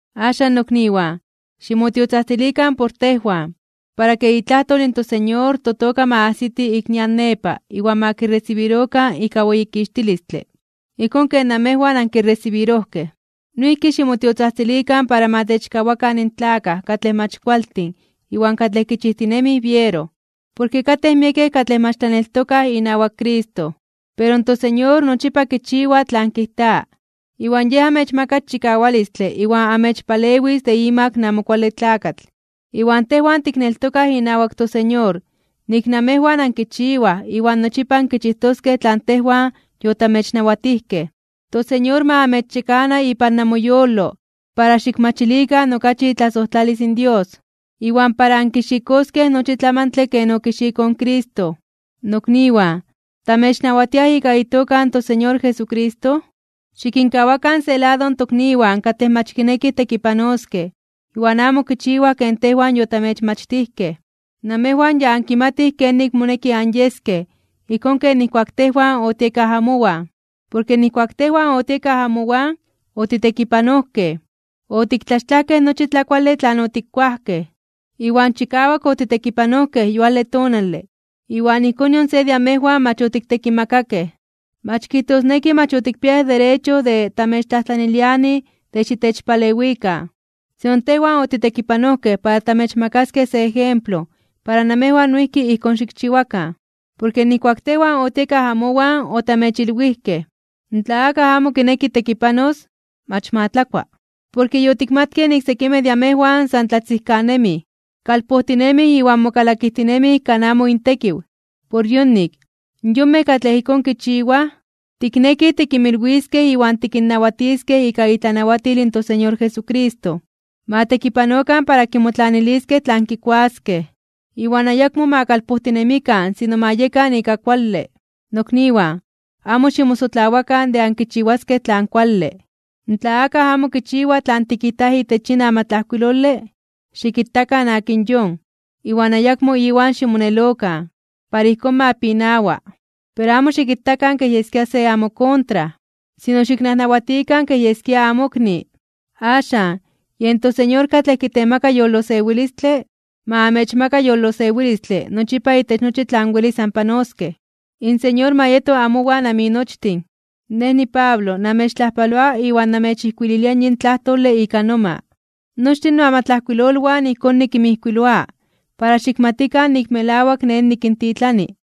Axan, nokniwan, ximotiotzajtzilikan por tejwan, para ke itlajtol in toSeñor totoka ma ajsiti ik nian nepa iwan ma kiresibirokan ika weyikixtilistle, ijkón ken namejwan ankiresibirojkej. Noijki ximotiotzajtzilikan para ma techkawakan in tlakaj katlej mach kualtin iwan katlej kichijtinemij biero, porke katej miekej katlej mach tlaneltokaj inawak Cristo. Pero in toSeñor nochipa kichiwa tlan kijta. Iwan Yej amechmakas chikawalistle iwan amechpalewis de imak in Amo Kuale Tlakatl. Iwan tejwan tikneltokaj inawak toSeñor nik namejwan ankichiwaj iwan nochipa ankichijtoskej tlan tejwan yotamechnawatijkej. ToSeñor ma amechyekana ipan namoyolo para xikmachilikan okachi itlasojtlalis in Dios, iwan para ankixikoskej nochi tlamantle ken okixikoj in Cristo. Nokniwan, tamechnawatiaj ika itoka in toSeñor Jesucristo, xikinkawakan se lado in tokniwan katlej mach kinekij tekipanoskej iwan amo kichiwaj ken tejwan yotamechmachtijkej. Namejwan ya ankimatij kenik moneki anyeskej ijkón ken nijkuak tejwan otiekaj amowan. Porke nijkuak tejwan otiekaj amowan, otitekipanojkej. Otiktlaxtlajkej nochi tlakuale tlan otikkuajkej. Iwan chikawak otitekipanojkej yuale tonale, iwan ijkón nion se de amejwan mach otiktekimakakej. Mach kijtosneki mach otikpiayaj derecho de tamechtlajtlanilianij de xitechpalewikan, sino tejwan otitekipanojkej para tamechmakaskej se ejemplo para namejwan noijki ijkón xikchiwakan. Porke nijkuak tejwan otiekaj amowan otamechilwijkej, tla akaj amo kinekij tekipanos, mach ma tlakua. Porke yotikmatkej nik sekimej de amejwan san tlatzijkanemij, kalpojtinemij iwan mokalakijtinemij kan amo intekiw. Por yonik, in yonmej katlej ijkón kichiwaj, tiknekij tikinmilwiskej iwan tikinnawatiskej ika itlanawatil in toSeñor Jesucristo, ma tekipanokan para kimotlaniliskej tlan kikuaskej, iwan ayakmo ma kalpojtinemikan sino ma yekan ika kuale. Nokniwan, amo ximosotlawakan de ankichiwaskej tlan kuale. Tla akaj amo kichiwa tlan tikijtaj itech yin amatlajkuilole, xikitakan akin yon, iwan ayakmo iwan ximonelokan, para ijkón ma pinawa. Pero amo xikitakan kej yeskia se amokontra, sino xiknajnawatikan kej yeskia amokni. Axan, yen toSeñor katlej kitemaka yolosewilistle, ma amechmaka yolosewilistle nochipa itech nochi tlan welis anpanoskej. In Señor ma yeto amowan aminochtin. Nej niPablo namechtlajpaloa iwan namechijkuililia yin tlajtole ika noma. Nochtin noamatlajkuilolwan ijkón nikinmijkuiloa para xikmatikan nik melawak nej nikintitlani.